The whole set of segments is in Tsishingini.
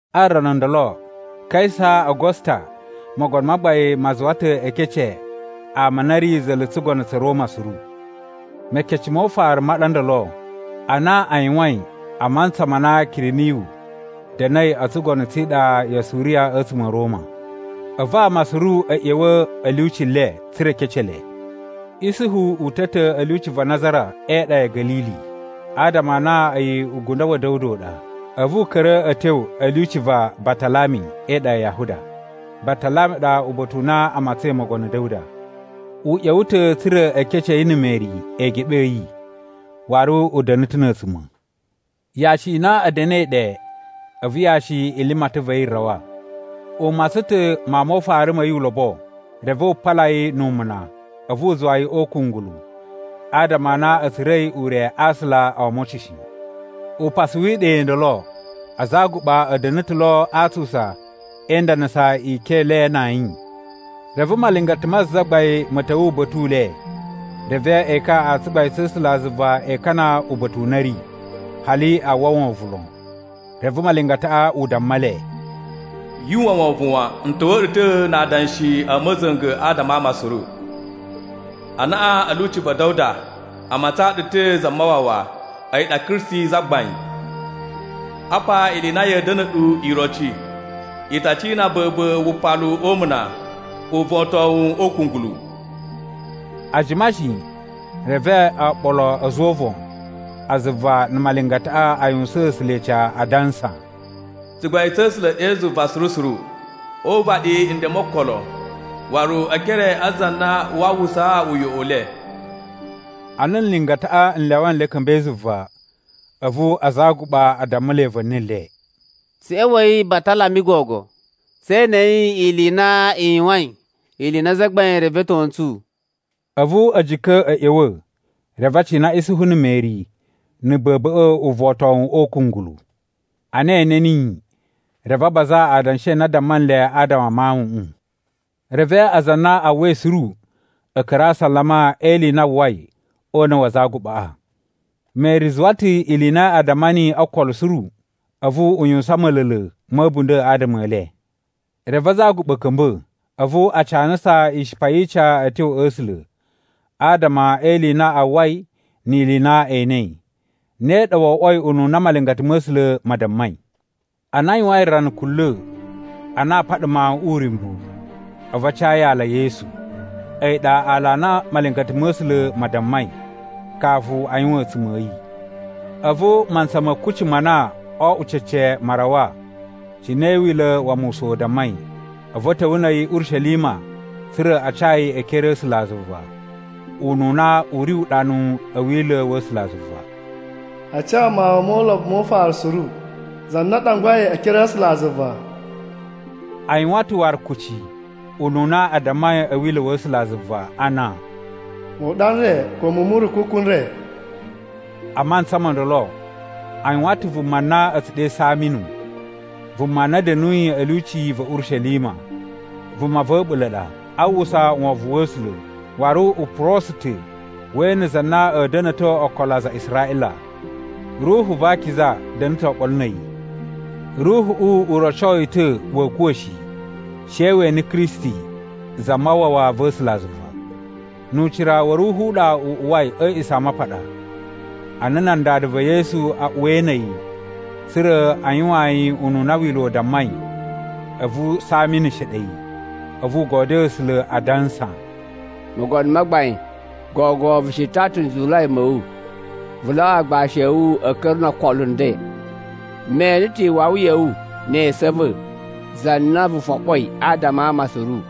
A rana ndolo, Kaisa Agusta mogono ma gbain ma zuwa ta̱ e kece ama a na a̱ ri za̱la̱ tsugono tsa̱ Roma suru. (Mekece mo ufaru ma ɗa ndolo, ana a yuwain a mantsa ma na Kiriniyu da̱na̱i o tsugono tsi iɗa ya Suriya a̱tsuma̱ a̱ Roma.) A̱vu ama suru a̱ ꞌya̱wa̱ a̱ lyuci le, tsa̱ra̱ e kece le. Isuhu uta̱ ta̱ a̱ lyuci va Nazara e iɗa ya̱ Ga̱lili. Adama a na a̱yi ugundo wa̱ Da̱wuda u ɗa, a̱vu u ka̱ra̱ a̱ tyo a̱ lyuci va Batalami e iɗa ya Yahuda. Batalami ɗa uba̱ta̱ u na a matsain mogono Da̱wuda. U ꞌya̱wa̱ ta̱ tsa̱ra̱ e kece yi na̱ Meri eegeɓe a̱ yi, waru u da̱na̱ ta̱ na̱ a̱a̱tsuma̱. Yashi i na a̱ da̱na̱i ɗe, a̱vu yashi i limatan va̱ yi rawa. U matsan ta̱ mawun mo ufaru ma̱ yi ulobo, reve wu pala yi nu umuna, a̱vu u zuwa yi o ukungulu. Adama a na a̱ tsura̱i ure a aasula o omocin shi. Upasu wi iɗa i ndolo, aza a aguɓa a̱ da̱na̱ ta̱ lo a atsusa e indanasa ikyon i le na ayin. Reve malingata ma Zagbain ma̱ ta̱wa̱ uba̱ta̱ u le, reve ekan a tsugbain tsa̱ A̱sulazuva e ikana uba̱ta̱ u na a̱ ri, hali a uwwa wovon lon. Reve malingataꞌa u damma le, “Yu uwwa wovon wan. N ta̱wa̱a̱ ɗu ta̱ na adanshi a̱ ma̱za̱nga̱ adama a ama suru. Anaꞌan a̱ lyuci va̱ Da̱wuda, a matsaan ɗu ta̱ Zamawawa, a̱yi ɗa Kristi Zagbain. Apa ili i na ya̱a̱ da̱na̱ ɗu iroci: I ta cina ba̱ba̱ wupalu o umuna, uvotowun o ukungulu.” A jima shi, reve oɓolo a̱ a̱za̱ o uvon a zuva na̱ malingataꞌa a yuwusaan A̱sula̱ ica, adansa, “Tsugbain tsa̱ A̱sula̱ ɗe zuva suru suru, o uvaɗi nden mo okolo waru e ekere a aza a na waa uwwusa uyoꞌo u le!” Ana nlingataꞌa n lyawa nle a̱ ka̱mba̱i zuva, a̱vu aza a aguɓa a dammulai va̱ni le, “Tsu ꞌya̱wa̱i Batalami gogo, tse enei ili i na i yuwain, ili i na Zagbain revetyo ntsu.” A̱vu a̱ jika̱ a̱ ꞌya̱wa̱, reve a cina Isuhu na̱ Meri na̱ ba̱ba̱ꞌa̱ uvotowun o ukungulu. Ana e ene niyi, reve a baza adanshi a na a damma nle adama a mawuꞌun. Reve aza a na a uwwai suru a̱ ka̱ra̱ a asalama e ili i na a uwwai o una̱ wa aza a aguɓaꞌa. Meri zuwa ta̱ ili i na a damma niyi o ookolo suru, a̱vu u yuwusan ma̱la̱la̱ ma̱ a̱bunda̱ adama e le. Reve aza a aguɓa a̱ ka̱mba̱. A̱vu a canasa ishipa yi ica a̱ tyo a̱ A̱sula̱, adama e ili i na a uwwai ni ili i na e enei. Ne ɗa wo oꞌwoi ununa malingata ma̱ A̱sula̱ ma dammai. Ana a yuwain rana kunla̱, a na aa paɗa mawuꞌun uryumbu, a̱vu a ca yi aala Yesu. A̱yi ɗa aala a na malingata ma̱ A̱sula̱ ma dammai, kafu a yuwan a̱a̱tsuma̱ a̱ yi. A̱vu mantsa ma̱ kucci ma na oo oꞌwo cece ma rawa, cine Wila̱ wa Musa u dammai. A̱vu a̱ ta̱wa̱ na̱ a̱yi Urishelima tsa̱ra̱ a ca yi e ekere a̱ A̱sulazuva. (Ununa u ri uɗanu a̱ Wila̱ wa̱ A̱sulazuva, “A ca mawun mo ulobo mo ufaru suru, za na a ɗangwai e ekere a̱ A̱sulazuva.”) A yuwan ta̱ waru kucci, ununa a dammai a̱ Wila̱ wa̱ A̱sulazuva ana, “Muɗa n re ko muwun mu nrukuku n re.” A mantsa mo ndolo, a yuwan ta̱ vuma na a̱ tsu ɗe Saminu, vuma na da̱nuyi a̱ lyuci va̱ Urishelima. Vuma va̱ a̱ɓula̱ ɗa, a uwwusa wovon wa̱ A̱sula̱, waru u purosu ta̱ we ene za na a̱a̱ da̱na̱to okolo a aza a Israꞌila. Ruhu va Akiza da̱na̱ ta̱ oɓolo na̱ a̱yi. Ruhuꞌu u roco yi ta̱ wa̱a̱ kuwa̱ shi, she we ene Kristi Zamawawa va̱ A̱sulazuva. Nu ucira wa̱ Ruhu u ɗa u uwai a̱ A̱a̱ꞌisamapaɗa. Ana nan dada va̱ Yesu a uwai na̱ a̱yi, tsa̱ra̱ a yuwaan yi ununa Wila̱ u dammai, a̱vu Saminu sheɗe yi, a̱vu u godyoo A̱sula̱, adansa, “Mogono ma Gbain, gogo vu shiton ta̱ nzuwulai ma̱ wu, vu lyawa aagbashi a̱ wu a̱ ka̱ra̱ no okolo nden. Me ene ta̱ iwawi ya̱ wu ne esu a̱ va̱, Za na vu foɓoi adama a ama suru.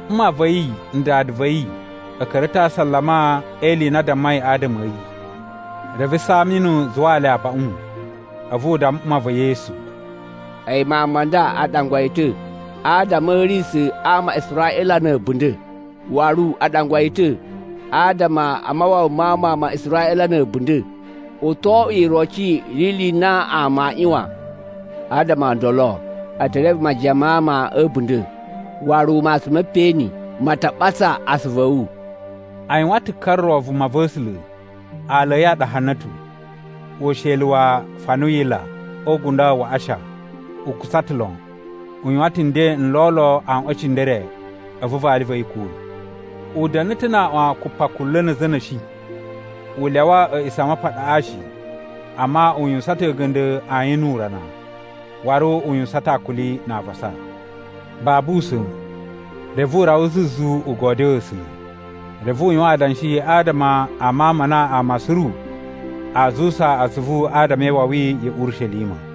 Mma va̱ yi na̱ dada va̱ yi a̱ ka̱ra̱ ta̱ a asalama e ili i na a dammai adama a̱ yi. Reve Saminu zuwaa le abaꞌun, a̱vu u damma mma va̱ Yesu, “A̱yi mawun ma nda a ɗangwa yi ta̱ adama a̱ a̱risa̱ a ama a Israꞌila na̱ a̱bunda̱. Waru a ɗangwa yi ta̱ adama a mawawa ma ama a Israꞌila na̱ a̱bunda̱. U to oꞌwo iroci yi ili i na ama aa ꞌyuwan. Adama o ndolo, e te reve majiyan ma ama a̱ a̱bunda̱. Waru matsun me peꞌeni ma ta ɓatsa asuvu a̱ wu.” A yuwan ta̱ ka ro vumava̱sula̱, aala a̱ yi a ɗa Hana̱tu, usheli wa Fanuyila o ugundo wa Asha. U kutsa ta̱ lon. U yuwan ta̱ nden n lolo aꞌwan e cindere, a̱vu vali va̱ yi kuwa̱. U da̱na̱ ta̱ na aꞌwan kupakunla̱ na̱ a̱za̱ a̱ na̱shi. U lyawa A̱a̱ꞌisamapaɗaꞌa shi, amma u yuwusan ta̱ a̱ga̱nda̱ ayin nu urana. Waru u yuwusan ta̱ akuli na avasa. Babu usa̱n, reve u rawa zuzu u godyoo A̱sula̱. Reve u yuwan adanshi adama a mawun ma na ama suru aa zuwusa atsuvu adama e iwawi ya̱ Urishelima.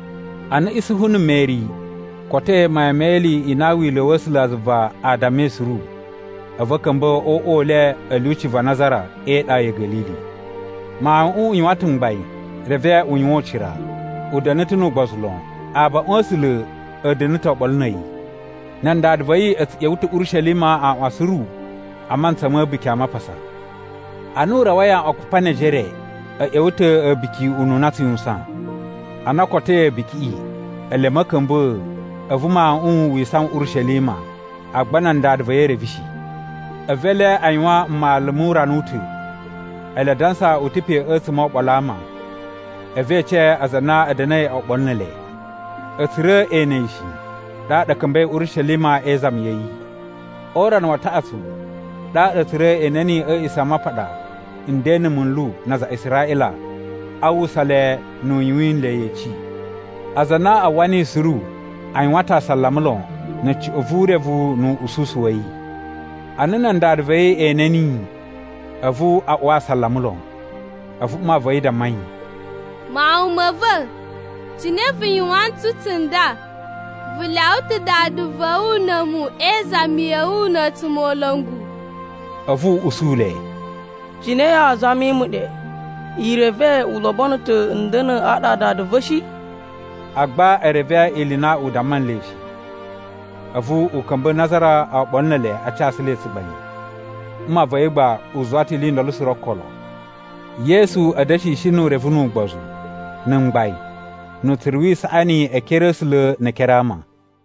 Ana Isuhu na̱ Meri kotoi mayan me ili i na Wila̱ wa̱ A̱sulazuva a dammai suru, a̱vu a̱ ka̱mba̱ o uꞌwa u le a̱ lyuci va Nazara e iɗa ya̱ Ga̱lili. Mawuꞌun u yuwan ta̱ mgbain reve u yuwan ucira, u da̱na̱ ta̱ nu ugbozu lon, abaꞌun a̱ A̱sula̱ a̱ da̱na̱ ta̱ oɓolo na̱ a̱yi. Nan dada va̱ yi a̱ tsu ꞌya̱wa̱ ta̱ Urishelima aaꞌwan suru a mantsa ma̱ A̱buki a Mapasa. Ana u rawai aꞌwan kupa ne ejere, a̱ ꞌya̱wa̱ ta̱ A̱buki ununa a tsu yuwusan. Ana o kotoi A̱bukiꞌi, ele a̱ ma̱ka̱mba̱a̱, a̱vu mawuꞌun wi isawan Urishelima, agba nan dada va̱ yi e reve shi. A̱vu ele a yuwan mmalu mu urana u ta̱, ele a dansa u ta̱ pe a̱tsuma̱ o oɓolo a ama. A̱vu e ece aza a na a̱ da̱na̱i oɓolo ne ele. A̱ tsura̱ e ene yi shi, ɗaɗa a̱ ka̱mba̱i Urishelima e izami ya̱ yi. O urana wa taꞌatsu, ɗaɗa a̱ tsura̱ e ene niyi a̱ A̱a̱ꞌisamapaɗa nden na̱ munlu na aza a Israꞌila, a uwwusa le nu u yuwin nle yeci. Aza a na a uwwa niyi suru, a yuwan ta̱ asalama lon na̱ cuꞌun vu urevu nu ususu wa̱ yi. Ana nan dada va̱ yi ene niyi, a̱vu a uwa asalama lon, a̱vu mma va̱ yi damma yi, “Mawun ma̱ va̱, cine vu yuwan ntsu tsunda? Vu lyawa ta̱ dada va̱ wu na̱ a̱mu e izami ya̱ wu na̱ a̱tsumola̱ngu.” A̱vu u usu le, “Cine yaa zami mu ɗe? I reve u lobono ta̱ n da̱na̱ aɗa a Dada va̱ shi?” Agba e reve ili i na u damma nle shi. A̱vu u ka̱mba̱ Nazara oɓolo ne ele a casu le tsugbain. Mma va̱ yi gba u zuwa ta̱ ili i ndolo suru o ookolo. Yesu a̱ da̱shishi nu urevu nu ugbozu, na̱ mgbain, nu utsuru wi isaꞌani e ekere a̱ A̱sula̱ ne e ekere a ama.